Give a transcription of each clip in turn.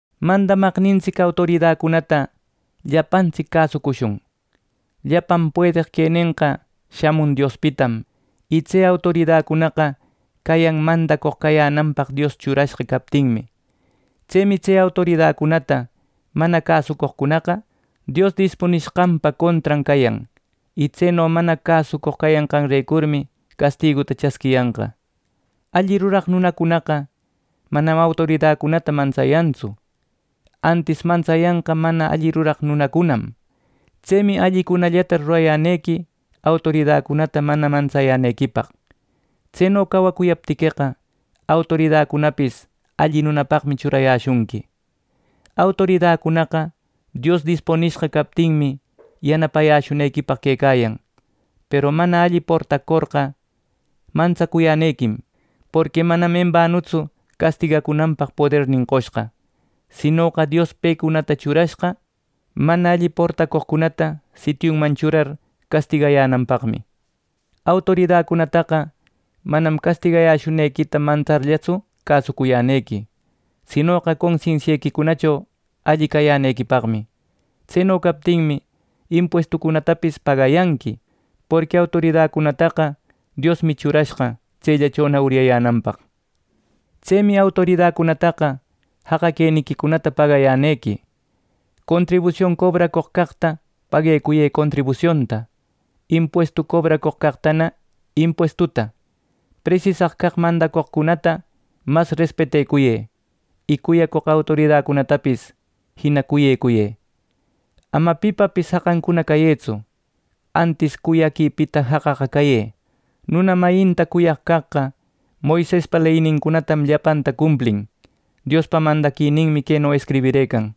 Mandamaqnintsic autoridacunata llapantsic cäsucushun. Llapan puedeq quenenqa shamun Diospitam y tse autoridacunaqa cayan mandacoq cayänanpaq Dios churashqa captinmi. Tsemi tse autoridacunata mana cäsucoqcunaqa Dios dispunishqanpa contran cayan; y tseno mana cäsucoq cayanqanrecurmi castiguta chasquiyanqa. Alli ruraq nunacunaqa manam autoridacunata mantsayantsu. Antis mantsayanqa mana alli ruraq nunacunam. Tsemi allicunallata rurayänequi autoridacunata mana mantsayänequipaq. Tseno cawacuyaptiqueqa, autoridacunapis alli nunapaqmi churayäshunqui. Autoridacunaqa Dios dispunishqa captinmi yanapayäshunequipaq quecayan. Peru mana alli portacorqa mantsacuyänequim, porqui manam embanutsu castigacunanpaq podernin qoshqa. Sinoqa Dios pecunata churashqa, mana alli portacoqcunata sitiunman churar castigayänanpaqmi. Autoridacunataqa manam castigayäshunequita mantsarllatsu cäsucuyänequi, sinoqa consensiequicunacho alli cayänequipaqmi. Tseno captinmi impuestucunatapis pagayanqui; porqui autoridacunataqa Diosmi churashqa tsellachona uryayänanpaq. Tsemi autoridacunataqa jaqa queniquicunata pagayänequi. Contribusion cobracoq caqta paguecuyë contribusionta, impuestu cobracoq caqtana impuestuta. Presisaq caq mandacoqcunata mas respetecuyë, y cuyacoq autoridacunatapis jina cuyecuyë. Ama pipapis jaqancuna cayëtsu, antis cuyaquipita jaqaqa cayë. Nuna mayinta cuyaq caqqa Moisespa leynincunatam llapanta cumplin. Diospa mandaquininmi queno escribirëcan: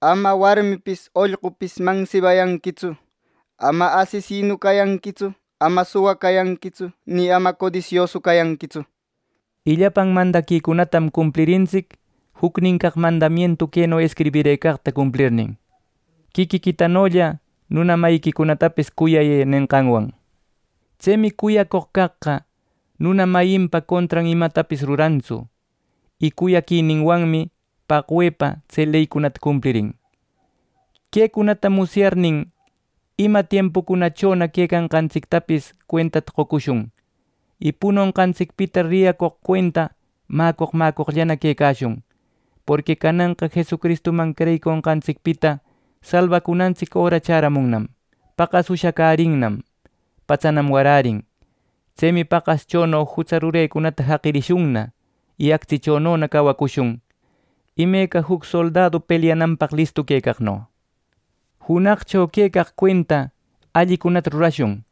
“Ama warmipis, ollqupis mansibayanquitsu; ama asesinu cayanquitsu; ama suwa cayanquitsu; ni ama codisiosu cayanqitsu” nir: y llapan mandaquicunatam cumplirintsic, jucnin caq mandamientu queno escribirëcaqta cumplirnin: “Quiquiquitanolla nuna mayiquicunatapis cuyayë” nenqanwan. Tsemi cuyacoq caqqa nuna mayinpa contran imatapis rurantsu y cuyaquininwanmi paqwepa tse leycunata cumplirin. Quecunata musyarirnin, ima tiempucunachona quecanqantsictapis cuentata qocushun y punonqantsicpita riyacoq cuenta mäcoq mäcoqllana quecashun; porqui cananqa Jesucristuman creyiconqantsicpita salbacunantsic öra chäramunnam. Paqas ushacärinnam, patsanam warärin. Tsemi paqaschono jutsa rurecunata jaqirishunna y actsichonona cawacushun, imeca juc soldadu pelyananpaq listu quecaqno. Junaqcho quecaq cuenta allicunata rurashun.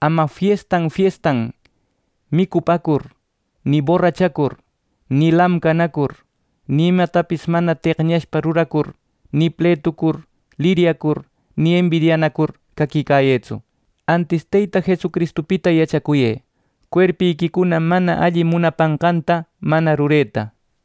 Ama fiestan, fiestan micupäcur, ni borrachacur, ni lamcanacur, ni imatapis mana teqñashpa ruracur, ni pletucur, liryacur, ni embidianacur caquicayëtsu. Antis Teyta Jesucristupita yachacuyë, cuerpiquicuna mana alli munapanqanta mana rureta.